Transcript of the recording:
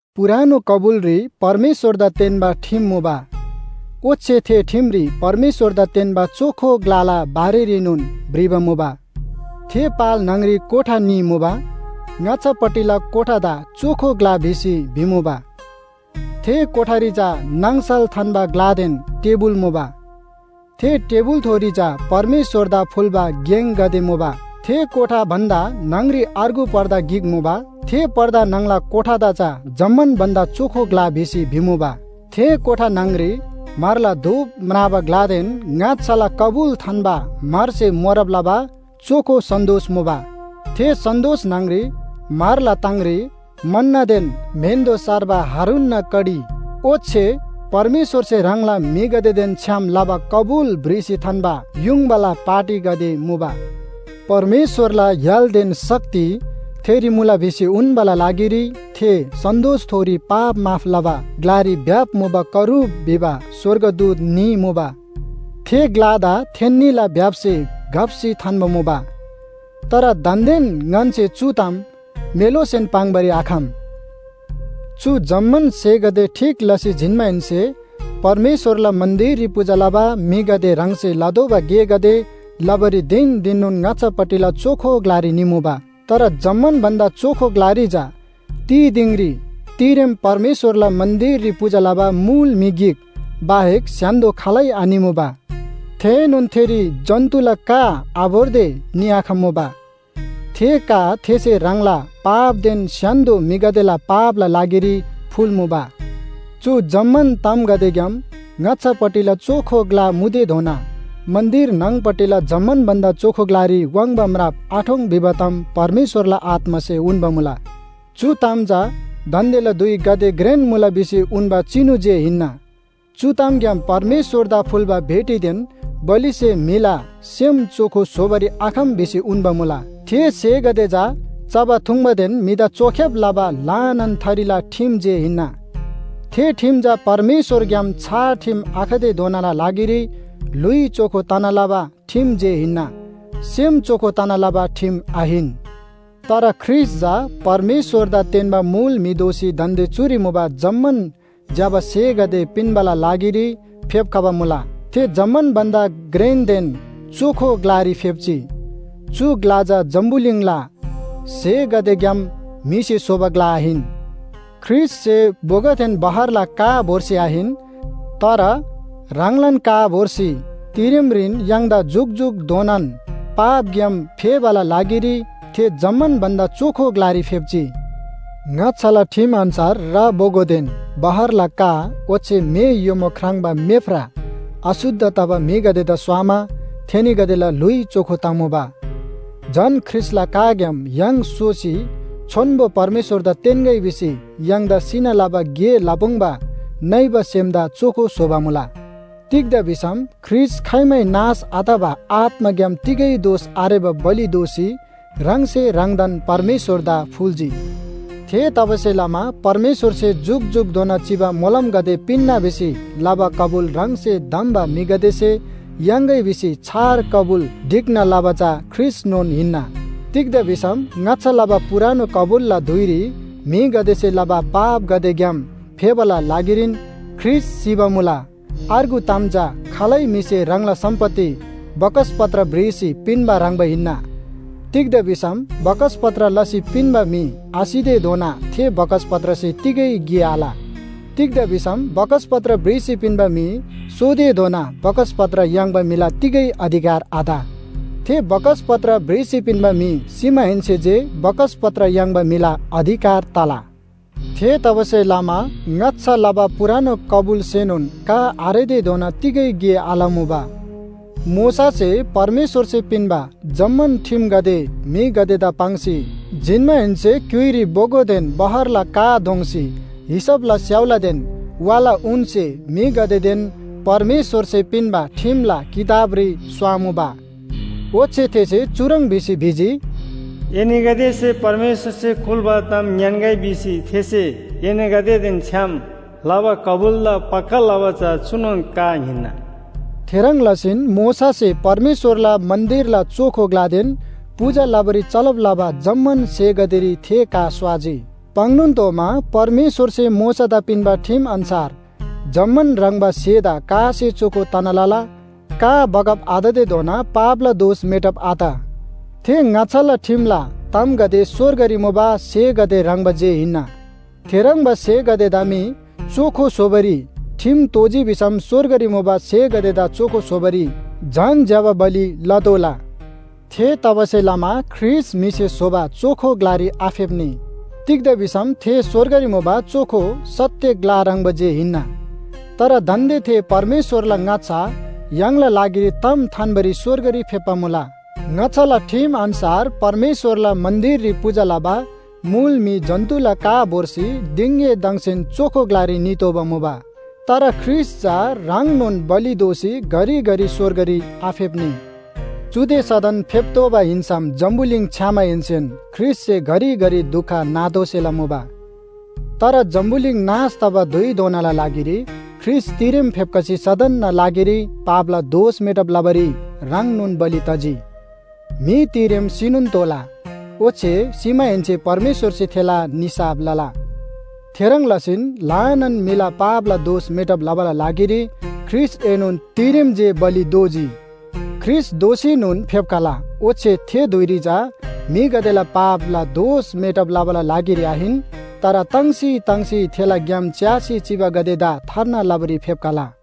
पुरानो कबुलरी परमेश्‍वरदा तेन्‍बा ठिम मुबा। ओच्‍छे थे ठिमरी परमेश्‍वरदा तेन्‍बा चोखो ग्‍लाला बारेरीनोन भ्रिबा मुबा। थे पाल न्‍हङरी कोठा न्‍ही मुबा। ङाच्‍छापट्टिला कोठादा चोखो ग्‍ला भिसी भिमुबा। थे कोठारी चा नाङसल थान्‍बा ग्‍लादेन टेबुल मुबा। थे टेबुलथोरी चा परमेश्‍वरदा फुल्‍बा गेङगदे मुबा। थे कोठा भन्‍दा न्‍हङरी अर्गु पर्दा गिक मुबा। थे पर्दा न्‍हङला कोठादा चा जम्‍मान भन्‍दा चोखो ग्‍ला भिसी भिमुबा। थे कोठा न्‍हङरी म्‍हरला धूप म्राबा ग्‍लादेन ङाच्‍छाला कबुल थान्‍बा म्‍हरसे मोरब लबा चोखो सन्‍दोस मुबा। थे सन्‍दोस न्‍हङरी म्‍हरला ताङरी मन्‍नदेन म्‍हेन्‍दो सार्बा हारूनना कडी ओच्‍छे परमेश्‍वरसे ह्राङला म्‍हिगदेदेन छ्‌याम लबा कबुल भ्रिसी थान्‍बा युङबाला पाटीगदे मुबा। परमेश्‍वरला य्‍हालदेन शक्ति थेरी मुला भिसी उन्‍बाला लागिरी थे सन्‍दोसथोरी पाप माफ लबा ग्‍लारी भ्‍याप मुबा करूब भिबा स्‍वर्गदूत न्‍ही मुबा। थे ग्‍लादा थेन्‍नीला भ्‍याप्‍से घप्‍सी थान्‍बा मुबा। तर दान्‍देन ङन्‍से चु ताम मेलोसेन पाङ्‌बारी आखम। चु जम्‍मान स्‍हेगदे ठीक लसी जिन्‍माहेन्‍से परमेश्‍वरला मन्‍दिररी पूजा लबा म्‍हिगदे ह्राङसे लतोःबा गेगदे लबारी धिन धिननोन ङाच्‍छापट्टिला चोखो ग्‍लारी निमुबा। तर जम्‍मान भन्‍दा चोखो ग्‍लारी चा तिदिङरी तिरेम परमेश्‍वरला मन्‍दिररी पूजा लबा मुल म्‍हि गिक बाहेक स्‍य्‍हान्‍दो खालै आनिमुबा। थेएनोन थेरी जन्‍तुला का आभोर्दे निआखम्‍मुबा। थे का थेसे ह्राङला पापदेन स्‍य्‍हान्‍दो म्‍हिगदेला पापला लागिरी फुल्‍मुबा। चु जम्‍मान तामगदेग्‍याम ङाच्‍छापट्टिला चोखो ग्‍ला मुतेधोना मन्‍दिर न्‍हङ‌पट्टिला जम्‍मान भन्‍दा चोखो ग्‍लारी वाङ्बा म्राप आठोङ् भिबा ताम परमेश्‍वरला आत्‍मासे उन्‍बा मुला। चु ताम चा दान्‍देला धुइ गाते घ्रेन मुला भिसी उन्‍बा चिनु जे हिन्‍ना। चु तामग्‍याम परमेश्‍वरदा फुल्‍बा भेटीदेन बलिसे म्‍हिला सेम चोखो स्‍होबारी आखम भिसी उन्‍बा मुला। थे स्‍हेगदे चा चबा थुङ्बादेन म्‍हिदा चोख्‍याब लबा ल्‍हानान थरीला ठिम जे हिन्‍ना। थे ठिम चा परमेश्‍वरग्‍याम छार ठिम आखतेधोनाला लागिरी ल्‍हुइ चोखो तना लबा ठिम जे हिन्‍ना, सेम चोखो तना लबा ठिम आहिन। तर ख्रीष्‍ट चा परमेश्‍वरदा तेन्‍बा मुल म्‍हि दोसी दान्‍दे चुरी मुबा जम्‍मान ज्‍यबा स्‍हेगदे पिन्‍बाला लागिरी फेप्‍खबा मुला। थे जम्‍मान भन्‍दा घ्रेनदेन चोखो ग्‍लारी फेप्‍जी। चु ग्‍ला चा जम्‍बुलिङला स्‍हेगदेग्‍याम म्‍हिसे स्‍होबा ग्‍ला आहिन। ख्रीष्‍टसे बोगोदेन बहरला का भोर्सी आहिन, तर ह्राङलान का भोर्सी तिरेमरीन य्‍हाङदा जुकजुकधोनान पापग्‍याम फेबाला लागिरी थे जम्‍मान भन्‍दा चोखो ग्‍लारी फेप्‍जी। ङाच्‍छाला ठिम अन्‍छार रा बोगोदेन बहरला का ओच्‍छे म्‍हे योमो ख्राङ्बा मेफ्रा अशुद्ध तबा म्‍हिगदेदा स्‍वामा थेनीगदेला ल्‍हुइ चोखो तमुबा। झन ख्रीष्‍टला काग्‍याम य्‍हाङ सोसी छोन्‍बो परमेश्‍वरदा तेन्‍गै भिसी य्‍हाङदा सिना लबा गे लपुङ्बा नइबा सेमदा चोखो स्‍होबा मुला। तिग्‍दा भिसम ख्रीष्‍ट खाइमै नाश आतबा आत्‍माग्‍याम तिगै दोष आरेबा बलि दोसी ह्राङसे ह्राङदान परमेश्‍वरदा फुल्‍जी। थेतबासेलमा परमेश्‍वरसे जुकजुकधोना चिबा मोलमगदे पिन्‍ना भिसी लबा कबुल ह्राङसे धम्‍बा म्‍हिगदेसे याङ्‌गै भिसी छार कबुल ढिक्‍ना लबा चा ख्रीष्‍टनोन हिन्‍ना। तिग्‍दा भिसम ङाच्‍छा लबा पुरानो कबुलला धुइरी म्‍हिगदेसे लबा पापगदेग्‍याम फेबाला लागिरीन ख्रीष्‍ट सिबा मुला। अर्गु ताम चा खालै म्‍हिसे ह्राङला सम्‍पत्ति बकसपत्र भ्रिसी पिन्‍बा ह्रङ्‌बा हिन्‍ना, तिग्‍दा भिसम बकसपत्र लसी पिन्‍बा म्‍हि आसितेधोना थे बकसपत्रसे तिगै गे आल। तिग्‍दा भिसम बकसपत्र भ्रिसी पिन्‍बा म्‍हि सोतेधोना बकसपत्र याङ्बा म्‍हिला तिगै अधिकार आत। थे बकसपत्र भ्रिसी पिन्‍बा म्‍हि सिमाहेन्‍से जे बकसपत्र याङ्बा म्‍हिला अधिकार तला। थेतबासेलमा ङाच्‍छा लबा पुरानो कबुलसेनोन का आरेतेधोना तिगै गे आलमुबा। मोशासे परमेश्‍वरसे पिन्‍बा जम्‍मान ठिमगदे म्‍हिगदेदा पाङ्सी जिन्‍माहेन्‍से क्‍युइरी बोगोदेन बहरला का दोङ्‌सी हिसपला स्‍याउलादेन वाला ऊनसे म्‍हिगदेदेन परमेश्‍वरसे पिन्‍बा ठिमला किताबरी स्‍वामुबा। ओच्‍छे थेसे चुह्रङ् भिसी भिजी, “एनीगदेसे परमेश्‍वरसे कुल्‍बा ताम ङ्‌यान्‍गै भिसी थेसे एनीगदेदेन छ्‌याम लबा कबुलदा पक्‍का लबा चा चुनोन का हिन्‍ना।” थेह्रङ् लसीन मोशासे परमेश्‍वरला मन्‍दिरला चोखो ग्‍लादेन पूजा लबारी चलब लबा जम्‍मान स्‍हेगदेरी थे का स्‍वाजी। पाङ्‌नोन तोःमा परमेश्‍वरसे मोशादा पिन्‍बा ठिम अन्‍छार जम्‍मान ह्रङ्‌बा स्‍हेदा कासे चोखो तना लला, का बगब आततेधोना पापला दोष मेटब आत। थे ङाच्‍छाला ठिमला तामगदे स्‍वर्गरी मुबा स्‍हेगदे ह्रङ्‌बा जे हिन्‍ना। थेह्रङ्बा स्‍हेगदेदा मी चोखो स्‍होबारी ठिम तोःजी भिसम स्‍वर्गरी मुबा स्‍हेगदेदा चोखो स्‍होबारी झन ज्‍यबा बलि लतोःला। थेतबासेलमा ख्रीष्‍ट म्‍हिसे स्‍होबा चोखो ग्‍लारी आफेप्‍नी। तिग्‍दा भिसम थे स्‍वर्गरी मुबा चोखो सत्‍य ग्‍ला ह्रङ्‌बा जे हिन्‍ना। तर दान्‍दे थे परमेश्‍वरला ङाच्‍छा य्‍हाङला लागिरी ताम थान्‍बारी स्‍वर्गरी फेप्‍बा मुला। ङाच्‍छाला ठिम अन्‍छार परमेश्‍वरला मन्‍दिररी पूजा लबा मुल म्‍हि जन्‍तुला का भोर्सी दिङएदङसेन चोखो ग्‍लारी नितोःबा मुबा। तर ख्रीष्‍ट चा ह्राङनोन बलि दोसी घरिघरि स्‍वर्गरी आफेप्‍नी। चुदे सदन फेप्‍तोःबा हिन्‍सम जम्‍बुलिङ छ्‌यामाहेन्‍सेन ख्रीष्‍टसे घरिघरि दुख नातोःसेला मुबा। तर जम्‍बुलिङ नाश तबा धुइधोनाला लागिरी ख्रीष्‍ट तिरेम फेप्‍खसी सदनना लागिरी पापला दोष मेटब लबारी ह्राङनोन बलि तजी। म्‍हि तिरेम सिनोन तोःला, ओच्‍छे सिमाहेन्‍से परमेश्‍वरसे थेला निसाफ लला। थेह्रङ् लसीन ल्‍हानान म्‍हिला पापला दोष मेटब लबाला लागिरी ख्रीष्‍टएनोन तिरेम जे बलि दोजी। ख्रीष्‍ट दोःसीनोन फेप्‍खला, ओच्‍छे थे धुइरी चा म्‍हिगदेला पापला दोष मेटब लबाला लागिरी आहिन, तर ताङ्सी ताङ्सी थेला ग्‍याम च्‍यासी चिबागदेदा थार्ना लबारी फेप्‍खला।